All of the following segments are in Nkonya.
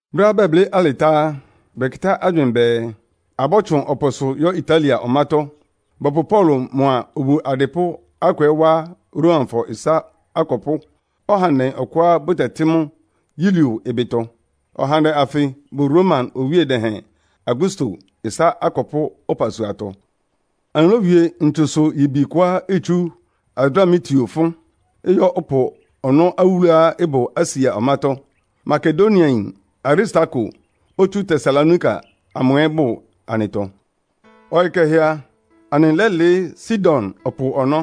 Brɛ́á bɛblɩ́ alɩ tá á, bɛkɩtá agywɩɩn bɛɛ, abɔ́tsʋn ɔpʋsʋ yɔ́ Italia ɔmátɔ́. Bɔpʋ Paulo mʋa obu adɩpʋ́ akʋ ɛ́ wá Romafɔ ɩsá akɔpʋ́ ɔhandɛ ɔkʋá bʋtɛtɩ́ mʋ Yulio ɩbɩtɔ. Ɔhandɛ anfɩ bʋ Roma Owíe Dɛhɛn Augusto ɩsá akɔpʋ́ ɔpasuatɔ. Anɩlówie ntsusʋ-yibi kʋá itsú Adramitio fʋ́n, ɩyɔ́ ɔpʋ ɔnɔ́ awúluá ɩbʋ Asia ɔmátɔ́. Makedoniayin Aristarko, otsú Tesalonika amʋ ɛ́ bʋ anɩtɔ. Ɔyɩ kɛhɛ a, anɩlɛ́lɩɩ́ Sidon ɔpʋ ɔnɔ́.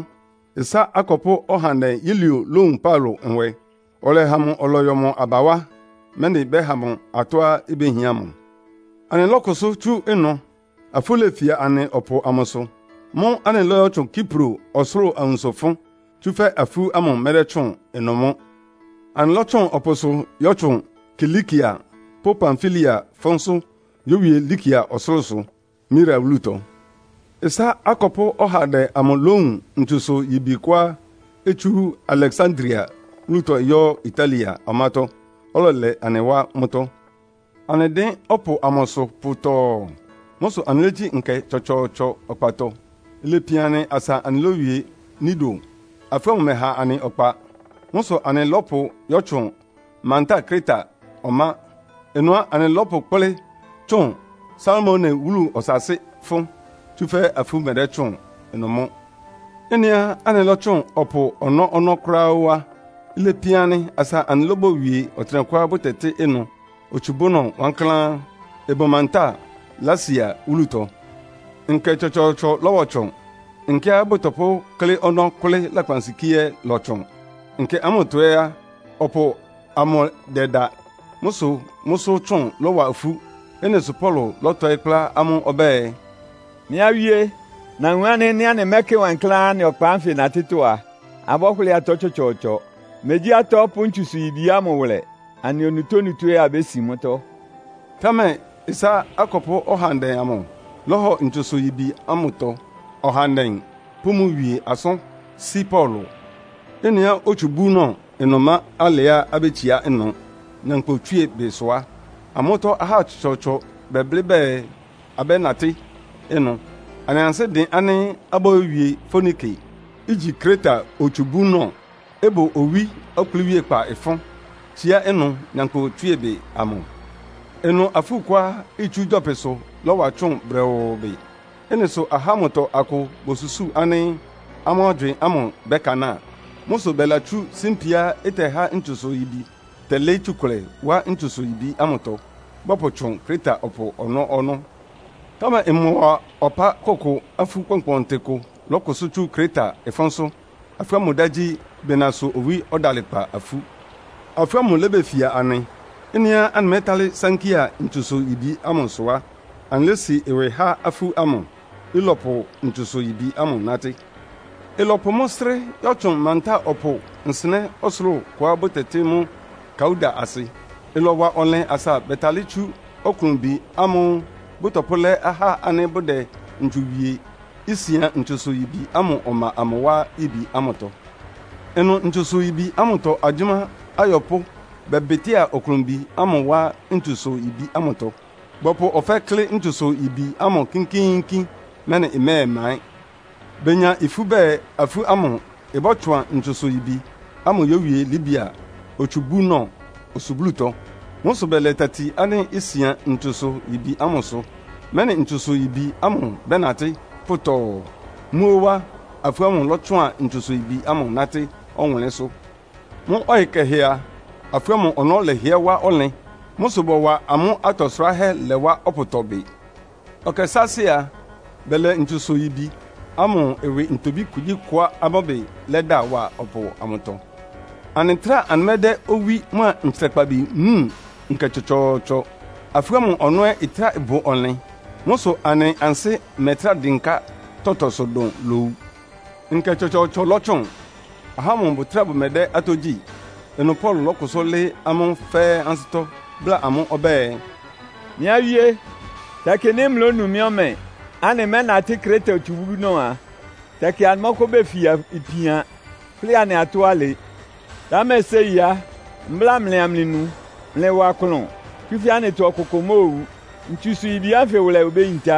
Ɩsá akɔpʋ́ ɔhandɛ Yulio lówun Paulo nwɛ, ɔlɛha mʋ ɔlɔyɔ mʋ aba wá, mɛ́nɩ bɛ́ha mʋ atɔ́á ibéhián mʋ. Anɩlɔ́kʋsʋ́ tsú ɩnʋ, afú lefia anɩ ɔpʋ amʋsʋ. Mʋ́ʋ́ anɩlɔ́yɔtsʋn Kipro ɔsʋlʋ́ʋ awunso fʋ́n, tsúfɛ́ afú ámʋ mɛdɛ́tsʋ́ʋn ɩnʋ mʋ́. Anɩlɔ́tsʋn ɔpʋsʋ yɔ́tsʋn Kilikia pʋ́ Pamfilia fʋ́nsʋ́ yówie Likia ɔsʋlʋ́sʋ, Mira wúlutɔ. Ɩsá akɔpʋ́ ɔhandɛ amʋ lówun ntsusʋ-yibi kʋá itsú Aleksandria wúlutɔ ɩyɔ́ Italia ɔmátɔ́, ɔlɛlɛ anɩ wá mʋ́tɔ́. Anɩdɩ́n ɔpʋ amʋsʋ pʋtɔɔ. Mʋ́ sʋ anɩlégyí nkɛ tsɔtsɔɔtsɔ ɔkpatɔ. Ilepian anɩ asa anɩlówie Knido. Afú ámʋ mɛ́ha anɩ ɔkpa. Mʋ́ sʋ anɩlɔ́pʋ yɔ́tsʋn mantáa Kreta ɔmá. Ɩnʋ á, anɩlɔ́pʋkplɩ́ tsʋn Salmone wúlu ɔsaasɩ́ fʋ́n. Tsúfɛ́ afú mɛdɛ́tsʋ́ʋn ɩnʋ mʋ́. Ɩ́nɩá anɩlɔ́tsʋn ɔpʋ ɔnɔ́-ɔnɔ́ kʋ́ráá ó á, ilepian anɩ asa anɩlóbowie ɔtɩnɛkʋá bʋtɛtɩ́ ɩnʋ “Otsubúnɔ Wankláán,” ɩbʋ mantáa Lasea wúlutɔ. Nkɛ tsɔtsɔɔtsɔ lɔ́bɔtsʋn, nkɛá bʋtɔpʋ́klɩ́ ɔnɔ́ kʋ́lɩ́ lakpansikíé ɛ́ ɩlɔtsʋn. Nkɛ ámʋtɔ ɛ́ á, ɔpʋ amʋ ɩdɛda. Mʋ́ sʋ mʋ́sʋ́ tsʋn lɔwa ifú. Ɩ́nɩ sʋ Paulo lɔ́tɔɩ́ kplá amʋ́ ɔbɛ́ɛ, “Mɩ́ awíé, nawun ánɩ́ nɩ́ anɩmɛ́kɩ wankláán anɩ ɔkpa ánfɩ natɩ́tɔ́ a, abɔ́hʋlɩ́ɩ atɔ́ tsɔtsɔɔtsɔ. Megyí atɔ́ pʋ́ ntsusʋ-yibi ámʋ wʋlɛ, anɩ onutónutó ɛ́ abésin mʋ́tɔ́.” Támɛ ɩsá akɔpʋ́ ɔhandɛ amʋ lɔ́hɔ ntsusʋ-yibi ámʋtɔ ɔhandɛ pʋ́ mʋ wie asʋ́n sí Paulo. Ɩ́nɩá otsubúnɔ ɩnʋ ɩma alɛá abétsiá ɩnʋ nyankpʋtswíebɩ sʋ á, amʋ́tɔ́ ahá tsɔtsɔɔtsɔ bɛblɩ́ bɛɛ abɛ́natɩ́ ɩnʋ. Amʋ́ ansɩ́ dɩn ánɩ́ abóyówie Foinike, igyi Kreta otsubúnɔ, ɩbʋ owí ɔkplɩ́wíékpá fʋ́n, tsíá ɩnʋ nyankpʋtswíebɩ amʋ. Ɩnʋ afú kʋá itsú gyɔpɩsʋ lɔ́wa tsʋ́ʋn brɛʋʋ bɩ. Ɩ́nɩ sʋ ahá ámʋtɔ akʋ bosusúu ánɩ́ amʋ́ agywɩɩn ámʋ bɛ́kanáa. Mʋ sʋ bɛlatsú símpiá ɩtɛhá ntsusʋ-yibi tɛlɩ́ɩ́ tsukʋlɛ wá ntsusʋ-yibi ámʋtɔ, bɔpʋtsʋn Kreta ɔpʋ ɔnɔ́-ɔnɔ́. Támɛ ɩmɔwa ɔpá kʋkʋ afú kpɔnkpɔntɩ kʋ lɔ́kʋsʋ́ tsú Kreta ɩfʋ́nsʋ́. Afú ámʋ dá gyí “Bɩnasʋ-owí-ɔdalɩkpa-afú.” Afú ámʋ lébefia anɩ. Ɩ́nɩá anɩmɛ́talɩ́ sánkɩ́a ntsusʋ-yibi ámʋ sʋ á, anɩlési ɩwɩ há afú ámʋ, ɩlɔpʋ ntsusʋ-yibi ámʋ nátɩ́. Ɩlɔpʋ mʋ́ srɩ́ yɔ́tsʋn mantáa ɔpʋ nsɩnɛ́ ɔsʋlʋ́ʋ kʋá bʋtɛtɩ́ mʋ́ Kauda asɩ. Ɩlɔwa ɔnlɩn asa bɛtalɩ́ tsú ɔklʋnbi ámʋ́ʋ́ bʋtɔpʋ́lɛ́ ahá ánɩ́ bʋdɛ ntsu wie, isian ntsusʋ-yibi ámʋ ɔma amʋ wá yibi ámʋtɔ. Ɩnʋ ntsusʋ-yibi ámʋtɔ agyʋ́má ayɔpʋ́ bɛbɩtɩ́a ɔklʋnbi ámʋ wá ntsusʋ-yibi ámʋtɔ. Bɔpʋ ɔfɛ́ klɩ́ ntsusʋ-yibi ámʋ kínkíínkín, mɛ́nɩ ɩmɛ́ɛmaɩ́n. Benya ifú bɛɛ afú ámʋ ɩbɔ́tsʋan ntsusʋ-yibi ámʋ yówie Libia otsubúnɔ osublútɔ. Mʋ́ sʋ bɛlɛ tati ánɩ́ isian ntsusʋ-yibi ámʋsʋ, mɛ́nɩ ntsusʋ-yibi ámʋ bɛ́natɩ́ pʋtɔɔ. Mʋ́ óó á, afú ámʋ lɔ́tsʋan ntsusʋ-yibi ámʋ nátɩ́ ɔwʋnlɩ́nsʋ́. Mʋ́ ɔyɩ kɛhɛ a, afú ámʋ ɔnɔ́ lɛhɩɛ́ wá ɔnlɩn. Mʋ́ sʋ bɔwa amʋ́ atɔ sʋráhɛ́ lɛ wá ɔpʋtɔ bɩ. Ɔkɛ sáásɩ́ a, bɛlɛ ntsusʋ-yibi ámʋ ɩwɩ ntobí kugyíkʋá amʋ́ ɩbɩ lɛ́da wá ɔpʋ amʋtɔ. Anɩtráa anɩmɛ́dɛ́ owí mʋ́a ntsrakpabi wúun nkɛ tsɔtsɔɔtsɔ, afú ámʋ ɔnɔ́ ɛ́ ɩtráa bʋ ɔnlɩn. Mʋ́ sʋ anɩ ansɩ́ mɛtrá dɩnká tɔtɔsʋ dʋn lowu. Nkɛ tsɔtsɔɔtsɔ lɔtsʋn, ahá ámʋ bʋtráa bʋmɛdɛ́ atɔ́ gyí. Ɩnʋ Paulo lɔ́kʋsʋ́ lɩ́ɩ́ amʋ́ fɛ́ɛ́ ansɩ́tɔ́, bláa amʋ́ ɔbɛ́ɛ, “Mɩ́ awíé, tɛkɩ nɩ́ mlɩlónu mɩ́ ɔmɛ, anɩmɛ́natɩ́ Kreta otsubúnɔ a, tɛkɩ anɩmɔ́kʋ́ befia ipian, hʋ́lɩ anɩ atɔ́ alɩ. Támɛ séi á, mbláa mlɩ amlɩnu. Mlɩwa klʋn, tsúfɛ́ anɩtɔ ɔkʋkʋ móowu, ntsusʋ-yibi ánfɩ wʋlɛ obéyintá.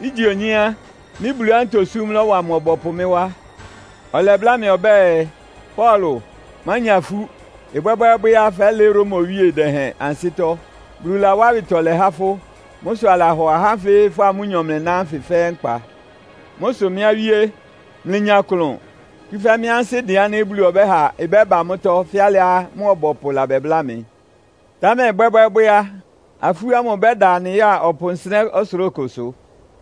Ígye onyé á, mɩ́ Buluá ntosúm lɔ́wa mʋ ɔbɔpʋ mɩ́ wá. Ɔlɛbláa mɩ ɔbɛ́ɛ, ‘Paulo, mánya ifú. Ɩbwɛ́bwɛ́ɛ́bwɛ́ á, fɛ́lɩɩ́ Roma Owíe Dɛhɛn ansɩ́tɔ́. Bulu lawá awɩtɔlɛ há fʋ́. Mʋ́ sʋ alahɔ ahá ánfɩ fʋ́a amʋ́nyɔ mlɩná ánfɩ fɛ́ɛ́ nkpa.’ Mʋ́ sʋ mɩ́ awíé, mlɩnya klʋn, tsúfɛ́ mɩ́ ansɩ́ dɩn ánɩ́ Bulu ɔbɛ́ha ɩbɛ́ba mʋ́tɔ́ fɛ́ alɩá mʋ ɔbɔpʋ labɛbláa mɩ. Támɛ ɩbwɛ́bwɛ́ɛ́bwɛ́ á, afú ámʋ ɩbɛ́da anɩ ya ɔpʋ nsɩnɛ́ ɔsʋlʋ́ʋ kʋsʋ.”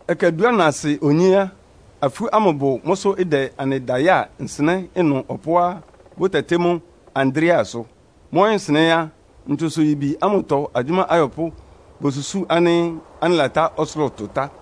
Ɛkɛ dúanasɩ onyé á, afú ámʋ bʋ mʋ́sʋ́ ɩdɛ anɩda yáa nsɩnɛ́ ɩnʋ ɔpʋá bʋ́tɛtɩ́ mʋ́ Adriasʋ. Mʋ́ ɔyɩ́nsɩnɛ́ á, ntsusʋ-yibi ámʋtɔ agyʋ́má ayɔpʋ́ bosusúu ánɩ́ anɩlatá ɔsʋlʋ́ʋ tʋ tá.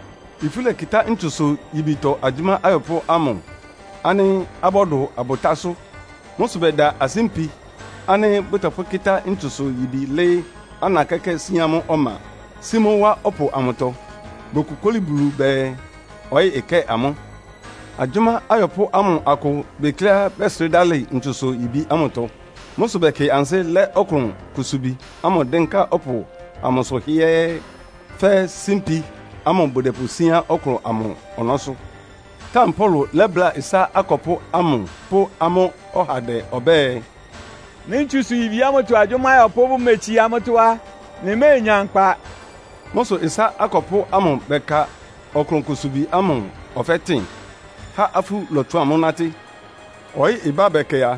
Ifú lɛkɩtá ntsusʋ-yibitɔ agyʋ́má ayɔpʋ́ ámʋ ánɩ́ abɔ́dʋ abʋtásʋ́. Mʋ́ sʋ bɛda asímpi ánɩ́ bʋtɔpʋ́kɩ́tá ntsusʋ-yibi lɩ́ɩ́ ana kɛ́kɛ́ síán mʋ́ ɔma, sí mʋ́ wá ɔpʋ amʋtɔ. Bokokóli Bulu bɛɛ ɔyɩ́ ɩkɛ́ɛ amʋ́. Agyʋ́má ayɔpʋ́ amʋ akʋ bekleá bɛ́srɩ́ dalɩ ntsusʋ-yibi ámʋtɔ. Mʋ́ sʋ bɛkɩ ansɩ́ lɛ́ ɔklʋn kusubi ámʋ dɩ́nká ɔpʋ amʋsʋ hɩ́ɛ́ɛ́, fɛ́ símpi ámʋ bʋdɛpʋsíán ɔklʋn ámʋ ɔnɔ́sʋ́. Támɛ Paulo lɛ́bláa ɩsá akɔpʋ́ ámʋ pʋ́ amʋ́ ɔhandɛ ɔbɛ́ɛ, “Nɩ́ ntsusʋ-yibi ámʋtɔ agyʋ́má ayɔpʋ́ bʋmetsiá mʋ́tɔ́ á, mlɩméenya nkpa.” Mʋ́ sʋ ɩsá akɔpʋ́ amʋ bɛka ɔklʋn kusubi ámʋ ɔfɛ́ tɩn, há afú lɔtsʋan mʋ́ nátɩ́. Ɔyɩ́ ɩbá bɛkɛ a,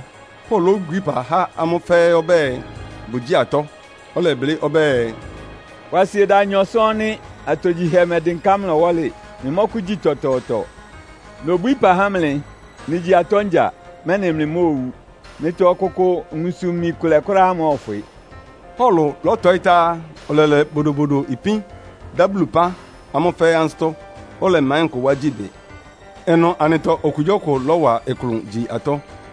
Paulo lóbwií ɩpa há amʋ́ fɛ́ɛ́ ɔbɛ́ɛ, bʋgyíi atɔ́. Ɔlɛblɩ́ ɔbɛ́ɛ, “Kwasieda anyɔ sɔ́ɔ́n nɩ́, atogyihɛ mɛdɩnká mlɩ ɔwɔ́lɩ. Mlɩmɔ́kʋ́gyi tɔtɔɔtɔ. Nobwíí ɩpa há mlɩ, mlɩgyi atɔ́ ngya, mɛ́nɩ mlɩmóowu. Mlɩtɔ ɔkʋkʋ nwunsʋ-imi kʋlɛ kʋ́ráá mɔ́ɔfwɩ.” Paulo lɔ́tɔɩ́ tá á, ɔlɛlɛ bodobodo ipín, dá Bulu ɩpán amʋ́ fɛ́ɛ́ ansɩ́tɔ́, ɔlɛmaɩ́n kʋ wá gyí bɩ. Ɩnʋ anɩtɔ okugyíɔkʋ lɔ́wa klʋn gyi atɔ́.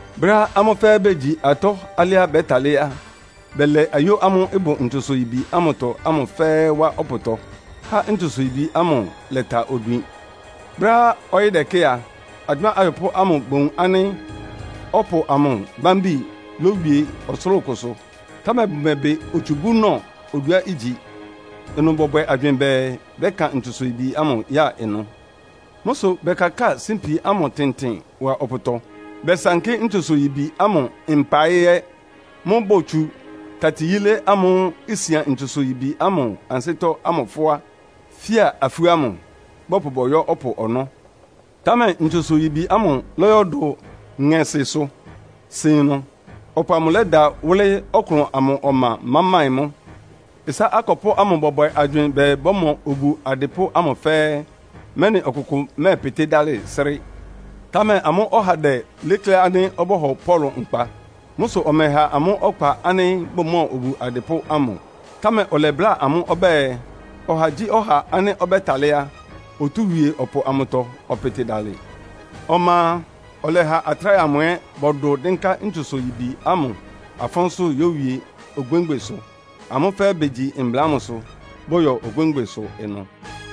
Brɛ́á amʋ́ fɛ́ɛ́ begyi atɔ́ alɩá bɛ́talɩ́ á, bɛlɛ ayó ámʋ́ʋ́ ɩbʋ ntsusʋ-yibi ámʋtɔ ámʋ fɛ́ɛ́ wá ɔpʋtɔ, há ntsusʋ-yibi ámʋ lɛta odwin. Brɛ́á ɔyɩ́ dɛkɛ́ a, agyʋ́má ayɔpʋ́ ámʋ bowun ánɩ́ ɔpʋ amʋ bámbi lowie ɔsʋlʋ́ʋ kʋsʋ, támɛ bʋmɛbɩ otsubúnɔ oduá igyi. Ɩnʋ bɔbwɛ agywɩɩn bɛɛ bɛ́kan ntsusʋ-yibi ámʋ ya ɩnʋ. Mʋ́ sʋ bɛkakáa símpi ámʋ tɩntɩn wa ɔpʋtɔ. Bɛsankɩ́ ntsusʋ-yibi ámʋ mpaɩ ɛ́. Mʋ́ʋ́ botsu tati yílé ámʋ́ʋ́ isian ntsusʋ-yibi ámʋ ansɩ́tɔ́ ámʋ fʋ́á, fía afú ámʋ, bɔpʋ bɔyɔ́ ɔpʋ ɔnɔ́. Támɛ ntsusʋ-yibi ámʋ lɔyɔ́dʋ ŋɛsɩsʋ, sin ɩnʋ, ɔpʋ amʋ lɛda wʋ́lɩ́ ɔklʋn amʋ ɔma máɩ́n-máɩ́n mʋ́. Ɩsá akɔpʋ́ ámʋ bɔbwɛ agywɩɩn bɛɛ bɔ́mɔ obu adɩpʋ́ ámʋ fɛ́ɛ́, mɛ́nɩ ɔkʋkʋ mɛ́ɛpɩtɩ́ dalɩ, srɩ́. Támɛ amʋ́ ɔhandɛ léklé ánɩ́ ɔbɔ́hɔ Paulo nkpa. Mʋ́ sʋ ɔmɛha amʋ́ ɔkpa ánɩ́ bʋmɔ́ɔ obu adɩpʋ́ ámʋ. Támɛ ɔlɛbláa amʋ́ ɔbɛ́ɛ, ɔhagyíɔha ánɩ́ ɔbɛ́talɩ́ á, otúu wie ɔpʋ amʋtɔ, ɔpɩtɩ dalɩ. Ɔma a, ɔlɛha atráhɛ amʋ ɛ́ bɔdʋ dɩ́nká ntsusʋ-yibi ámʋ afʋnsʋ yówie ogbémgbesʋ. Amʋ́ fɛ́ɛ́ begyi mbla ámʋsʋ, bɔyɔ ogbémgbesʋ ɩnʋ.